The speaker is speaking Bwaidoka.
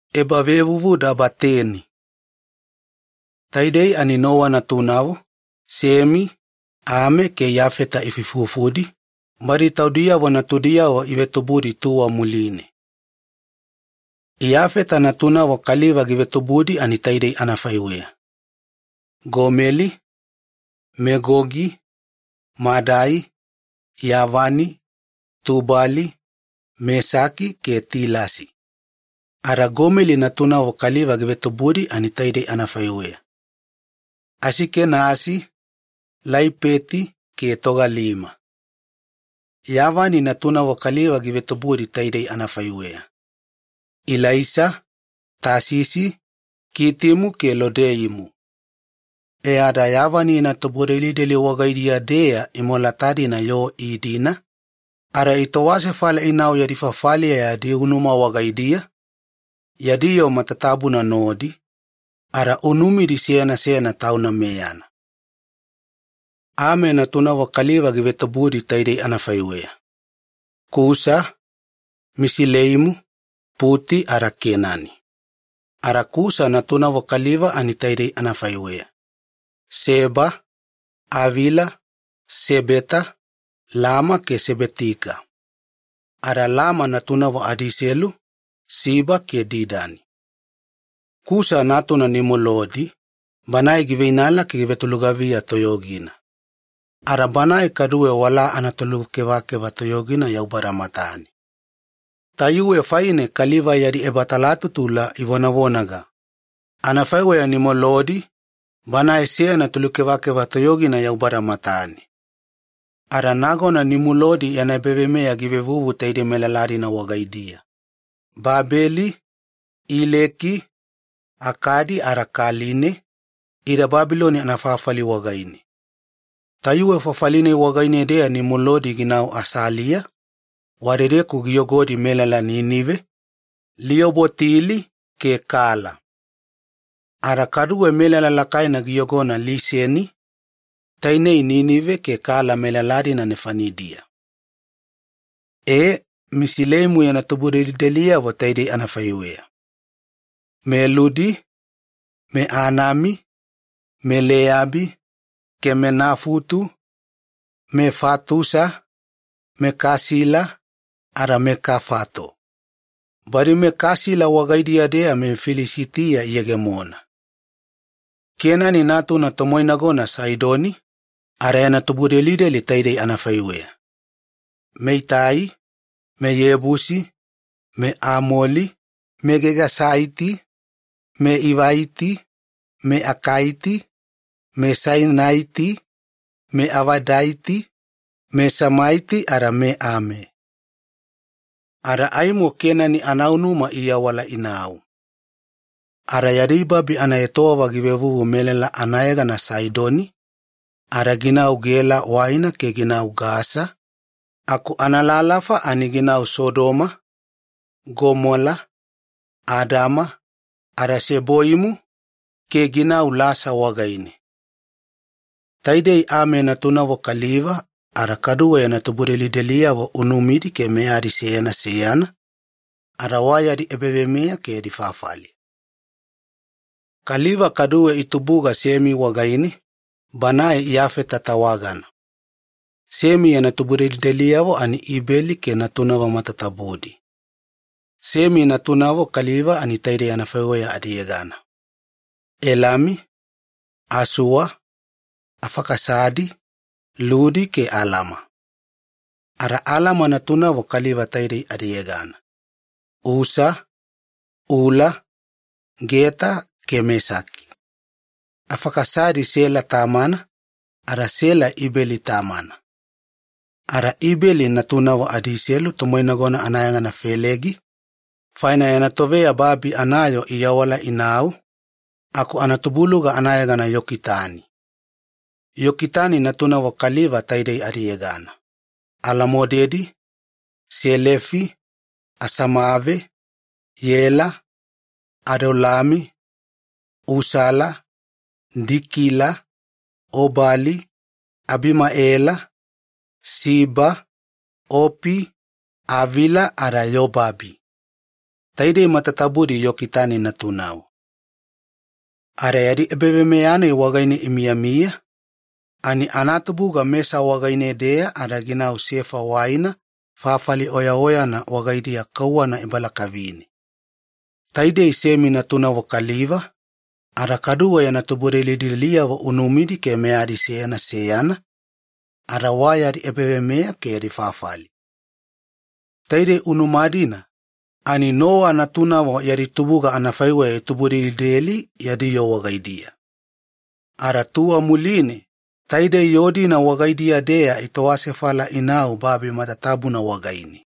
Yoo giveinala ada iawala. Taidei Nowa natunavo, Semi, Ame ke Iyafeta ifuifufudi, badi taudiyavo natudiyavo ivetubudi tuwa muline. Iyafeta yana tubudelideliyavo. Iyafeta natunavo kaliva givetubudi ani taidei anafaiweya: Gomeli, Megogi, Madai, Yavani, Tubali, Mesaki ke Tilasi. Ada Gomeli natunavo kaliva givetubudi ani: Asikenasi, Laipeti ke Togalima. Yavani natunavo kaliva givetubudi taidei anafaiweya: Ilaisa, Tasisi, Kitimu ke Lodeimu. E ada Yavani yana yana tubudelideli wagaidiya-deya imolata-dina yoo iidina ada itowasefala inau yadi fafaliya yadi unuma wagaidiya, yadi yoo matatabuna nodi, ada unumidi seyana seyana tauna meyana. Ame yana tubudelideliyavo. Ami natunavo kaliva givetubudi taidei anafaiweya: Kusa, Misilaimi, Puti ada Kenani. Ada Kusa natunavo kaliva ani: Seba, Avila, Sebeta, Lama ke Sebetika. Ada Lama natunavo adiiselu, Siba ke Didani. Kusa natuna Nimulodi, bana giveinala ani givetolugaviya toyogina. Ada banae kaduwe walaa anatolukevakeva toyogina Yaubada matane. Tayuwe faine kaliva yadi ebatalatutula ivonavonaga, “Anafaiweya Nimulodi, banae seyana tolukevakeva toyogina Yaubada matane.” Ada nagona Nimulodi yana ebaveimeya givevuvu taidei melala-dina wagaidiya, Babeli, Ileki, Akadi ada Kaline, ida Babiloni anafafali wagaine. Tayuwe fafali-nai wagaine-deya Nimulodi ginau Asiliya, wadedeku giyogodi melala Ninive, Lioboti-ili ke Kala. Ada kaduwe melala lakaina giyogona Liseni, Ninive ke Kala melala-dina nefanidiya. E, Misileimu yana tubudelideliyavo taidei anafaiweya: meLudi, meAnami, meLeabi, ke meNafutu, meFatusa, meKasila, ada meKafato. Badi meKasila wagaidiya-deya meFilisitiya iyegemona. Kenani natuna tomoinagona Saidoni. Ada yana tubudelideli anafaiweya: meItai, meYebusi, Amolaiti, Gegasaiti, Ivaiti, Akaiti, Sainaiti, Avadaiti, Semaiti ada meAme. Ada aimo Kenani anaunuma iawala inau, ada yadi babi anaetowava givevuvu melala adiyegana Saidoni ada ginau Gela waina ke ginau Gasa aku analalafa ani ginau Sodoma, Gomola, Adama ada Seboimu ke ginau Lasa wagaine. Taidei Ami natunavo kaliva, ada kaduwe yana tubudelideliyavo unumidi ke meyadi seyana seyana, ada wayadi ebaveimeya ke yadi fafali. Semi yana tubudelideli. Kaliva kaduwe itubuga Semi wagaine, banae Iyafeta tawagana. Semi yana tubudelideliyavo Ibeli ke natunavo matatabudi. Semi natunavo kaliva taidei anafaiweya adiyegana: Elami, Asua, Afakisadi, Ludi ke Alama. Ada Alama natunavo kaliva taidei adiyegana: Usa, Ula, Geta ke Mesaki. Afakisadi Sela tamana, ada Sela Ibeli tamana. Ada Ibeli natunavo adiiselu, tomoinagona anayegana Felegi, faina yana toveya babi anayoo iawala inau, aku anatubuluga anayegana Yokitani. Yokitani natunavo kaliva taidei adiyegana: Alamodedi, Selefi, Asamave, Yela, Adolami, Usala, Dikila, Obali, Abimaela, Siba, Opi, Avila ada Yobabi. Taidei matatabudi Yokitani natunavo. Ada yadi ebaveimeya-nai wagaine imiyamiya ani anatubuga Mesa wagaine-deya ada ginau Sefa waina fafali oyaoyana wagaidiya kauwana ebalakavine. Taidei Semi natunavo kaliva, ada kaduwe yana tubudelideliyavo unumidi ke meyadi seyana seyana, ada wayadi ebaveimeya ke yadi fafali. Taidei unuma-dina ani Nowa natunavo yadi tubuga anafaiweya itubudelideli, yadi yoo wagaidiya. Ada tuwa muline taidei yoo-dina wagaidiya-deya itowasefala inau babi matatabuna wagaine.